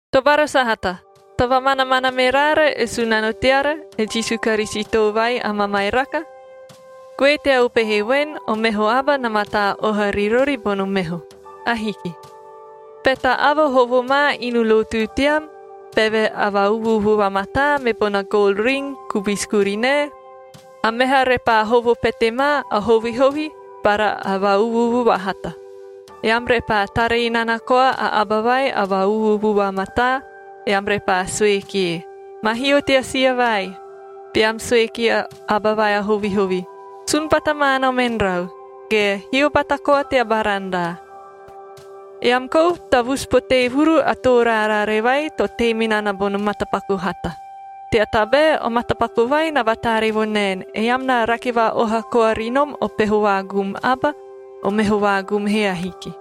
Tobara sahata, to vamanamana me raara e Sunano teara, e Jisu Karisito vai a mamairaka, goe tea upehe voen, o meho aba na mataa oha ri rori bono meho. Ahiki. Be ta aba hovo ma inu lotu team beve a va-uvu-uvu vamataa, me bona gol ring kubisi kurinae, a meha repaa hovo pete ma, a hovihovi bara va-uvu-uvu vahata, eam repaa tara inana koa a aba vai a va-uvu-uvu vamataa, eam repaa sue kie, “Ma hio tea sia vai,” beam sue kia aba vai a hovihovi, “Sun bata ma nom en rau,” ge “Hio bata koa teo barandaa.” Eam kou tavusu potee vuru a too raarare vai to tei me nana bono matapaku hata, tea tabae o matapaku vai na vataaree vo naen, eam na rake va-oha koa ri nom o peho vaagum aba, o meho vaagum he ahiki.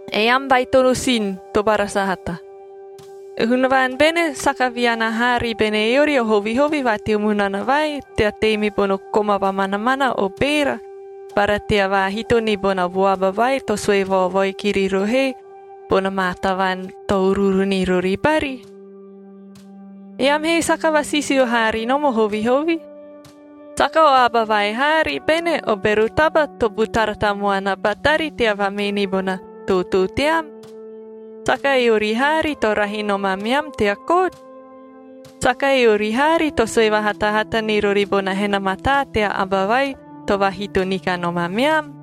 Eam baitono sin, tobara sahata. E Hunavaan bene saka viana haa ribene eori o hovihovi va teo munana vai, tea tei me bono koma vamanamana o beera bara tea vaahito ni bona vuabaa vai to sue vaovoi kiri rohoe bona maa tavaan to uruuru ni rori bari? Eam he saka vasisio haa ri nom o hovihovi. Saka o aba vai haari bene o bero taba to butara tamuana batari tea vamee ni bona tootoo team? Saka eori haari to rahi nom ameam tea kot? Saka eori haari to sue vahatahata ni rori bono hena mataa tea Aba vai to vaahito ni kanom ameam?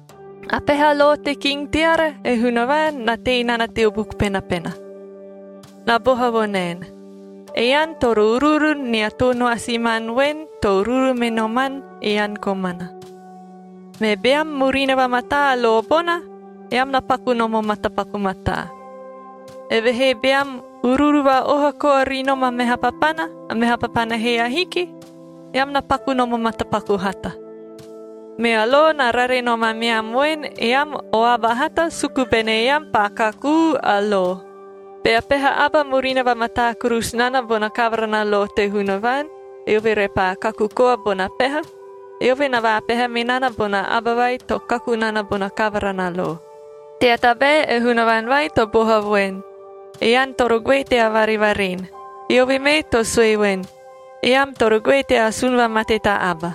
A peha lo te king teara, e Hunavaan, na tei nana teo Buku Penapena. Na boha vo naen, “Ean toro uruuru nia too noasimanb voen to uruuru me noman ean komana.”c Me beam murina vamataa a lo bona, eam na paku nom o matapaku mataa. Evehee beam uruuru va-oha koa ri nom a meha papana, a meha papana he ahiki, eam na paku nom o matapaku hata. Mea lo na rare nom ameam voen eam o aba hata suku bene eam paa kakuu a lo. Bea peha aba murina vamataa kurusu nana bona kavara na lo te Hunavaan, eove repaa kaku koa bona peha, eove na vaapeha me nana bona aba vai to kaku nana bona kavara na lo. Tea tabae e Hunavaan vai to boha voen, “Ean toro goe tea varevaren,” eove mee to sue voen, “Eam toro goe tea asun vamate ta aba.”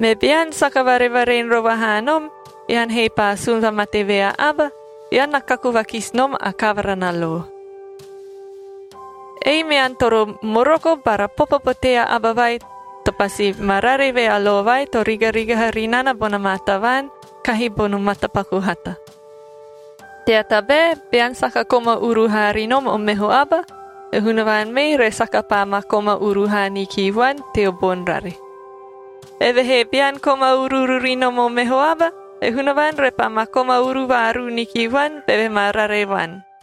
Me bean saka varevaren rova haa nom, ean he paa asun vamate vea aba, ean na kaku vakisi nom a kavara na lo. Ei mean toro moroko bara popo potee a aba vai to pasi ma rare vea lo vai to rigarigaha ri nana bona maa tavaan kahi bono matapaku hata. Tea tabae bean saka koma uru haa ri nom o meho aba, e Hunavaan mee re saka paa ma koma uru haa ni ki vuan teo boni rare. Evehee bean koma uru ri nom o meho aba, e Hunavaan repaa ma koma uru vaaruu ni ki vuan beve ma rare vuan.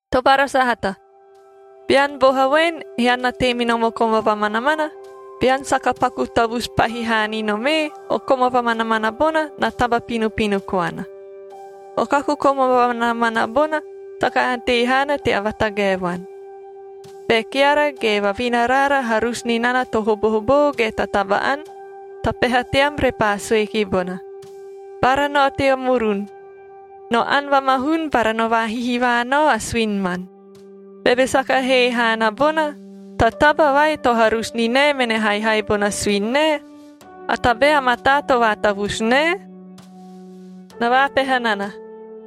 Tobara sahata, bean boha voen, ean na tei me nom o koma vamanamana, bean saka paku tavusu pahi haa ni nom ee, o koma vamanamana bona na taba pinopino koana. O kaku koma vamanamana bona saka ante haana tea vatagae vuan. Be keara ge vavina raara harusu ni nana to hobohoboo ge ta taba-ani, ta peha team repaa sue ki bona, “Bara nao tea murun; no ani vamahun bara no vaahihivaa nao a suini man,” beve saka hee haana bona ta taba vai to harusu ni nae mene haihai bona suini nae, a tabae a mataa to vaatavusu nae? Na vaapeha nana,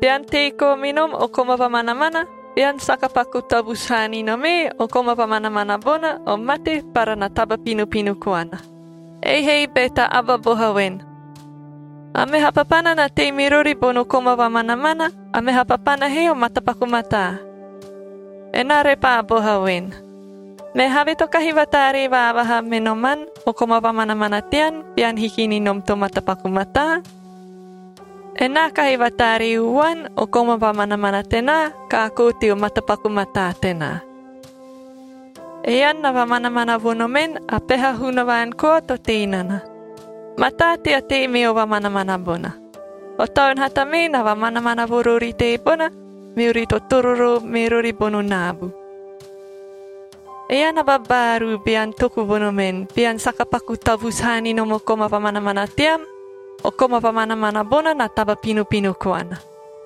bean tei koa me nom o koma vamanamana, bean saka paku tavusu haa ni nom ee, o koma vamanamana bona, o mate bara na taba pinopino koana. Ei he be ta aba boha voen, “A meha papana na tei me rori bono koma vamanamana, a meha papana he o matapaku mataa.” Enaa repaa boha voen, “Me havee to kahi vataaree vaavaha me noman o koma vamanamana tean bean hiki ni nom to matapaku mataa? Enaa kahi vataaree uvuan o koma vamanamana tenaa kaakoo teo matapaku mataa tenaa.” Ean na vamanamana vo nomen, a peha Hunavaan koa to tei nana. Mataa tea tei meo vamanamana bona. O taun hata mee na vamanamana vo rori teebona, meori totororoo me rori bono naabu. Ean a babaaruu bean toku vo nomen, bean saka paku tavusu haa ni nom o koma vamanamana tean, o koma vamanamana bona na taba pinopino koana.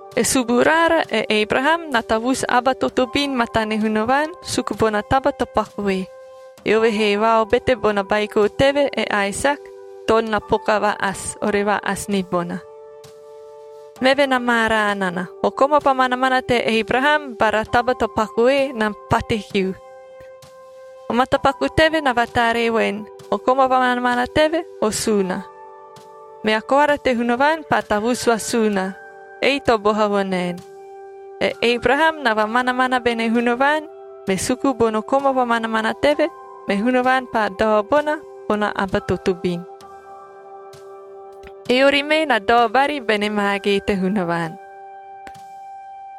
E suburaara, e Ebraham, na tavusu aba totobin matane Hunavaan suku bona taba to pakue, eove he vaobete bona baiko teve, e Aesak, toon na poka va-asi, ore va-asi ni bona. Meve na maaraa nana, o koma vamanamana te Ebraham bara taba to pakue na pate kiu. O matapaku teve na vataaree voen, o koma vamanamana teve o suuna. Mea Koara te Hunavaan paa tavusu vasuuna, ei to boha vo naen, “E Ebraham na vamanamana bene Hunavaan, me suku bono koma vamanamana teve, me Hunavaan paa dao bona, bona aba totobin.” Eori mee na dao bari bene maagee te Hunavaan.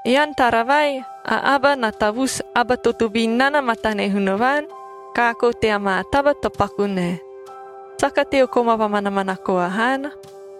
Ean tara vai, a aba na tavusu aba totobin nana matane Hunavaan, kaakoo tea maa taba to paku nae. Saka teo koma vamanamana koa haana.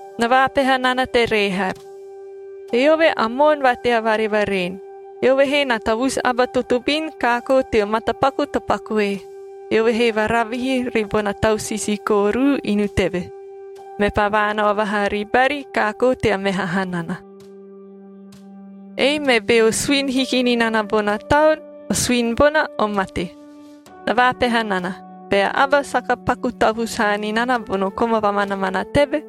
Na vaapeha nana te Rehab. Eove a moon va tea varevaren, eove he na tavusu aba totobin kaakoo teo matapaku to pakue, eove he varavihi ribona tau sisiikoorud inu teve, mepaa vaanao vahaa ribari kaakoo tea meha hanana. Ei me beo suini hiki ni nana bona taun, o suini bona o mate. Na vaapeha nana, bea aba saka paku tavusu haa ni nana bono koma vamanamana teve,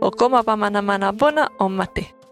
o koma vamanamana bona o mate.